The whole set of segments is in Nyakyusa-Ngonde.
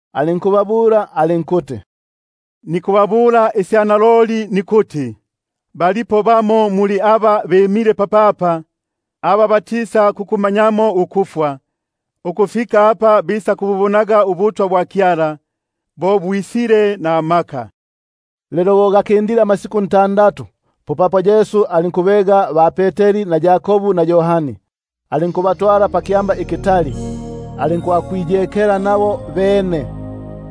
Alinkubabula alinkuti: Naloli nikubabula une nikuti, balimo bamo muli aba bimile papapa, aba batisakukumanyamo ukufwa, ukufika apa bisakububonaga ubutwa bwa Kyala, bo bwisile namaka. Lelo bo gakindile amasiku ntandatu, popapo Yesu alinkubega ba-Peteri na Yakobu na Yohani alinkubatwala pakyamba ikitali, alinkwakwiyekela nabo bene.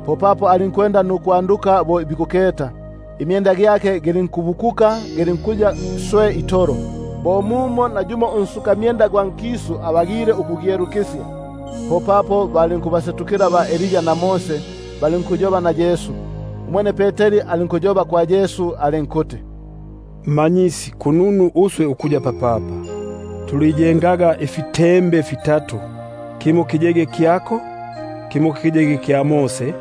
Popapo alinkwanduka bo bikuketa; imyenda gyake gilinkubikuka gilmkuya swe itolo, bo mumo nayumo unsukamyenda gwa nkisu abagile ukugyelukisya. Popapo balinkubasetukila ba-Elia na Mose, balinkuyoba na Yesu. Umwene Peteri alinkumwamula Yesu alinkuti: Rabi,#Rabi, ko kuti Mmanyisi. kununu uswe ukuyapo papapa, tuliyengaga ifitembe fitatu, kimo kiyege kyako, kimo kya Mose,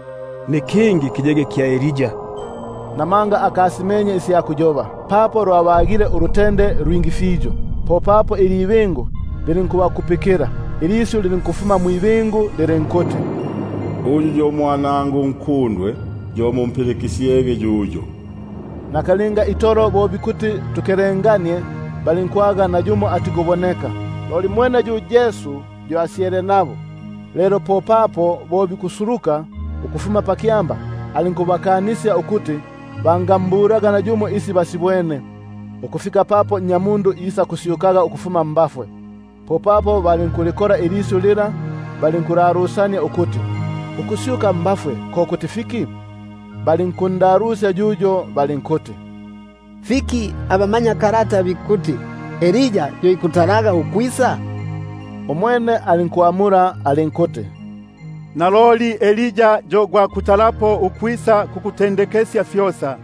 nikingi kya Elia. Namanga akasimenye nisi amulaga, papo lwabagile ulutende lu lwingi fiyo. Popapo ilibingu lilinkusuluka nukubakupikila, ilisyu lilinkufuma mwibingu lilinkuti: Uyu yo Mwanangu unkundwe, yo mumpilikisyege yuyo. Nakalinga itolo bo bikuti tukelenganie, balinkunyomoka nayumo atikuboneka, loli mwene yu Yesu yo asyele nabo. Lelo bo bikusuluka ukufuma pakyamba, alinkubakanisya ukuti bangambulaga nayumo sisyo basibwene, ukufika papo Nnyamundu isakusyukaga ukufuma mbafwe. Popapo balinkulikola ilisyu lila, balinkulalusania ukuti ukusyuka mbafwe ko kuti fiki. Abene balinkundalusya balinkuti: Fiki abama- nyakalata bikuti, fikuti Elia atalege ukwisa? Umwene alinkuti: Naloli, Elia yo gwa kutalapo ukwisa kukutendekesya fyosa;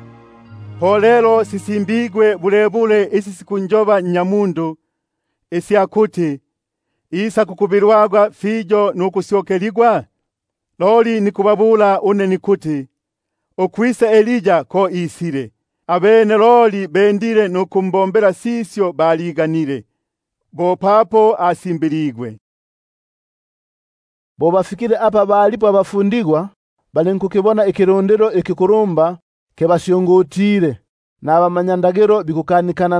sisimbigwe bulebule isi sikunjoba Nnyamundu? Isya kuti, isakukubilwaga fiyo nukusyokeligwa. Loli nikubabula une nikuti naloli Elia alisile, loli balimbombile sisyo balondaga, bo papo asimbiligwe. Bo bafikile apa balipo abafundigwa, balinkukibona ikilundilo ikikulumba kibasyungutile, nabamanyakalata bikukanikana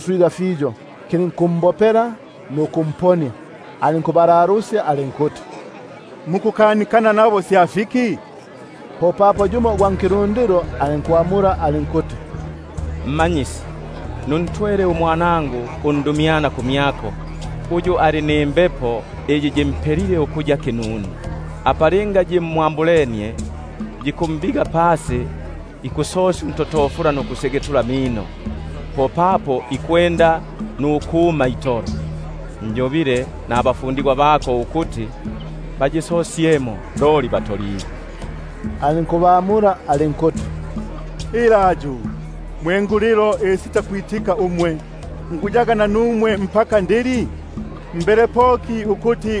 swiga fiyo, kilinkumbopela nukumponia. Alinkubalalusya alinkuti: Mukukanikana nabo sya fiki? Popapo yumo ugwa nkilundilo alinkumwamula alinkuti: Mmanyisi, nuntwele umwanangu undumyana kumyako, uyu ali nimbepo iya kinunu; apa linga yimwambulenie, yikumbiga pasi, ikusosya untotofula nukusyegetula amino, popapo ikuma itolo. Njobile nabafundigwa bako ukuti bayisosyemo, loli batoligwe. Alinkubamula alinkuti: Ilayu, mwe ngulilo isitakwitika umwe, nguyaga nanumwe ukufika ndili? Mbele poki ukuti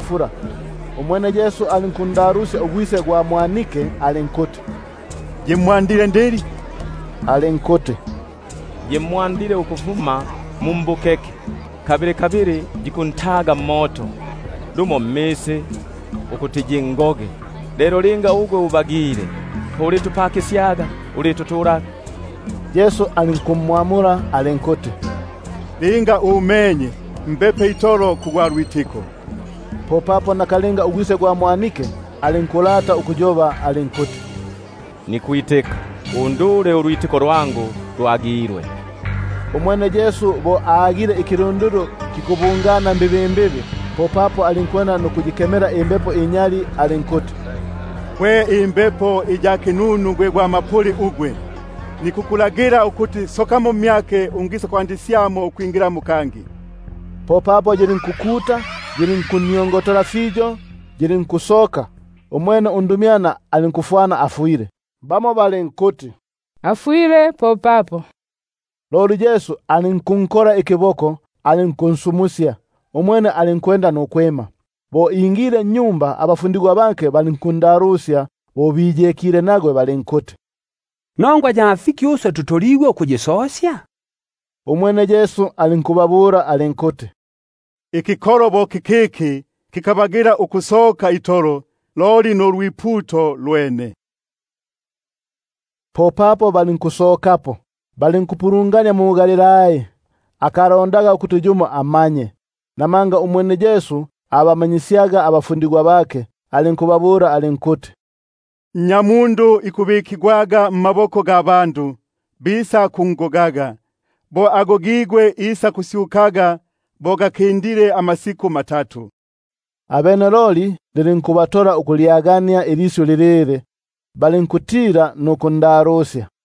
fula. Umwene Yesu alinkundalusya ugwise alinkuti: Yimwa- ndile ndili? Alinkuti: Ukufuma mbukeke, kabili kabili yikuntaga mmoto, lumo mmisi ukuti yingoge. Lelo linga umenye fimo, ulimpakisyaga nukututula. Yesu alinkumbula alinkuti: Linga umenye! Mbepe itolo kugwa lwitiko. Popapo ugwise gwa mwanike alinkukolela alinkuti: Nikwitika; undule ukusitakwitika kwangu. Umwene Yesu bo agile ikilundilo kikubungana mbibimbibi, popapo alinkuyikemela imbepo inyali alinkuti: Gwe mbepo iya kinunu gwe gwa mapuli ugwe, nikukulagila ukuti sokamo mmyake ungisa- kwandisya ukwingilamo kangi. Popapo yilinkukolela yilinkundusania fiyo yilinkusoka; umwene umwanike alinku- fwana afwile, mo muno ba bingi balinkuti afwile. Loli Yesu alinkunkola ikiboko alinkunsumusya, umwene alinkwe- nda nukwima. Bo ingile nnyumba, abafundigwa bake balinkundalusya bo biyekile nagwe balinkuti: Nongwa ya fiki uswe tutoligwe ukuyisosya? Umwene alinkubabula alinkuti: Ikikolo bo kikiki kikabagila ukusoka itolo, loli na lu lwiputo lwene. Popapo balinkusokapo, balinkupulungania mu-Galilai. Akalondaga ukuti yumo amanye, namanga abamanyisyaga abafundigwa bake. Alinkubabula alinkuti: Nnyamundu ikubikigwa mmaboko ga bandu, bisakungoga; bo agogigwe isaku- syuka bo gakindile amasiku matatu. Abene loli bakalyagenie ilisyu lilili, balinkutila nukundalusya.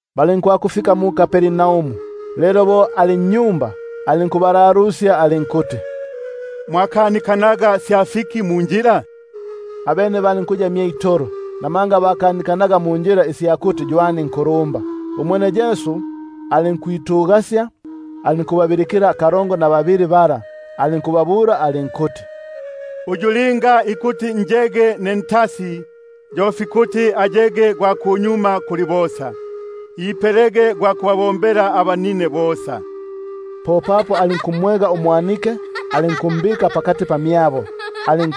Balinkwakufika mu-Kapernaumu. Lelo bo ali nnyumba, alinkubalalusya alinkuti: Mwakanikanaga sya fiki munjila? Abene balinkuya mye itolo, namanga bakanikanaga munjila ukuti ywani unkulumba. Umwene alinkwitugasya, alinkubabilikila kalongo na babili bala alinkubabula alinkuti: Uyu linga ikuti njege ne ntasi, yo fikuti ayege gwa kunyuma kuli bosa, ipelege gwa kubabombela abanine bosa. Popapo alinkumwega umwanike, alinkumbika pakati pamyabo; ali-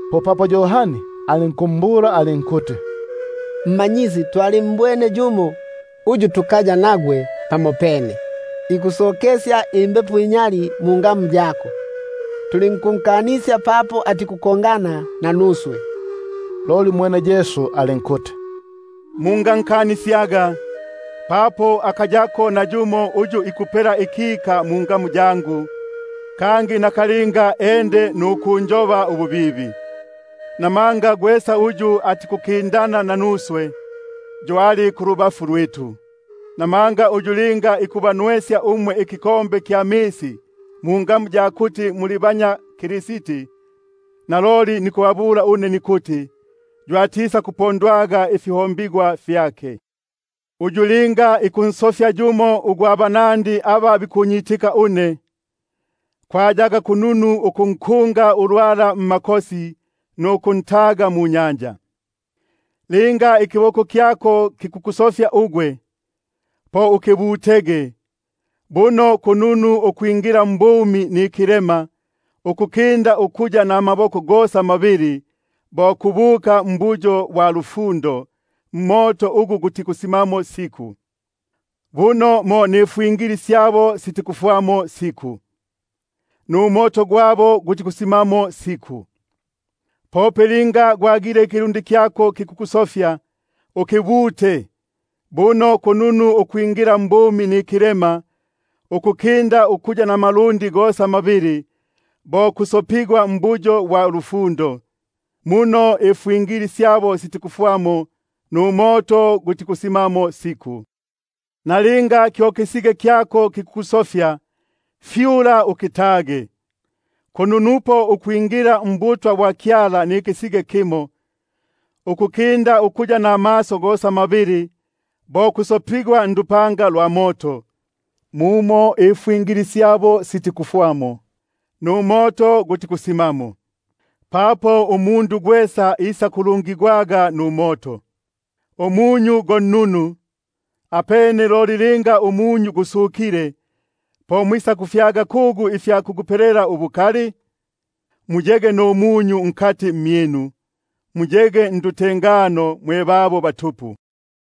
Popapo Yohani alinkumbula alinkuti: Mmanyisi, twalimbwene yumo uyu tukaya nagwe pamopene, ikusokesya imbepo inyali mungamu yako; tulinkunkanisya papo atiku- kongana nanuswe. Umwene Yesu alinkuti: Mungankanisyaga; papo akayapo nayumo uyu ikupela ikika mungamu yangu, kangi nakalinga ende nukunjoba ububibi. Namanga gwesa uyu atikukindana nanuswe, yo ali kulubafu lwitu. Papo gwesa uyu ikubanwesya ikinwelo kya misi mungamu ya kuti muli banya Kristi, naloli nikubabula une nikuti, yo atisakupondwa ifihombigwa fyake. Uyu linga ikunsofya yumo ugwa banandi aba bikunyitika une, kwayaga kununu ukunkungilila ulwala mmakosi nuku- ntaga munyanja. Linga ikiboko kyako kikukusofya, ukibute; buno kununupo ukwingila mbumi nikilema, ukukinda ukuya namaboko gosa mabili bo kubuka mu-Gehena,#Gehena, ko kuti mbuyo bwa lufundo. mmoto ugu gutikusima siku; [mumo ifwingili yabo yitikufwamo, numoto gutikusimamo.] Pope linga ikilundi kyako kikukusofya, ukibute; buno kununupo ukwingila mbumi nikilema, ukukinda ukuya namalundi gosa mabili bo kusopigwa mu-Gehena; [mumo ifwingili yabo yitikufwamo, numoto gutikusimamo.] Kalinga ikisige kyako kikukusofya, fyula ukitage; kununupo ukwingila mbutwa bwa Kyala nikisige kimo, ukukinda ukuya namaso gosa mabili bo kusopigwa mu-Gehena; mumo ifwi- ngili yabo yitikufwamo, numoto gutikusimamo. Papo umundu gwesa isakulungigwaga numoto. Umunyu go nnunu; loli linga umunyu gusukile, po mwisakufyaga kugu ifya kugupelela ubukali? Muyege numunyu nkati mmyinu, muyege ndutengano mwe babo batupu.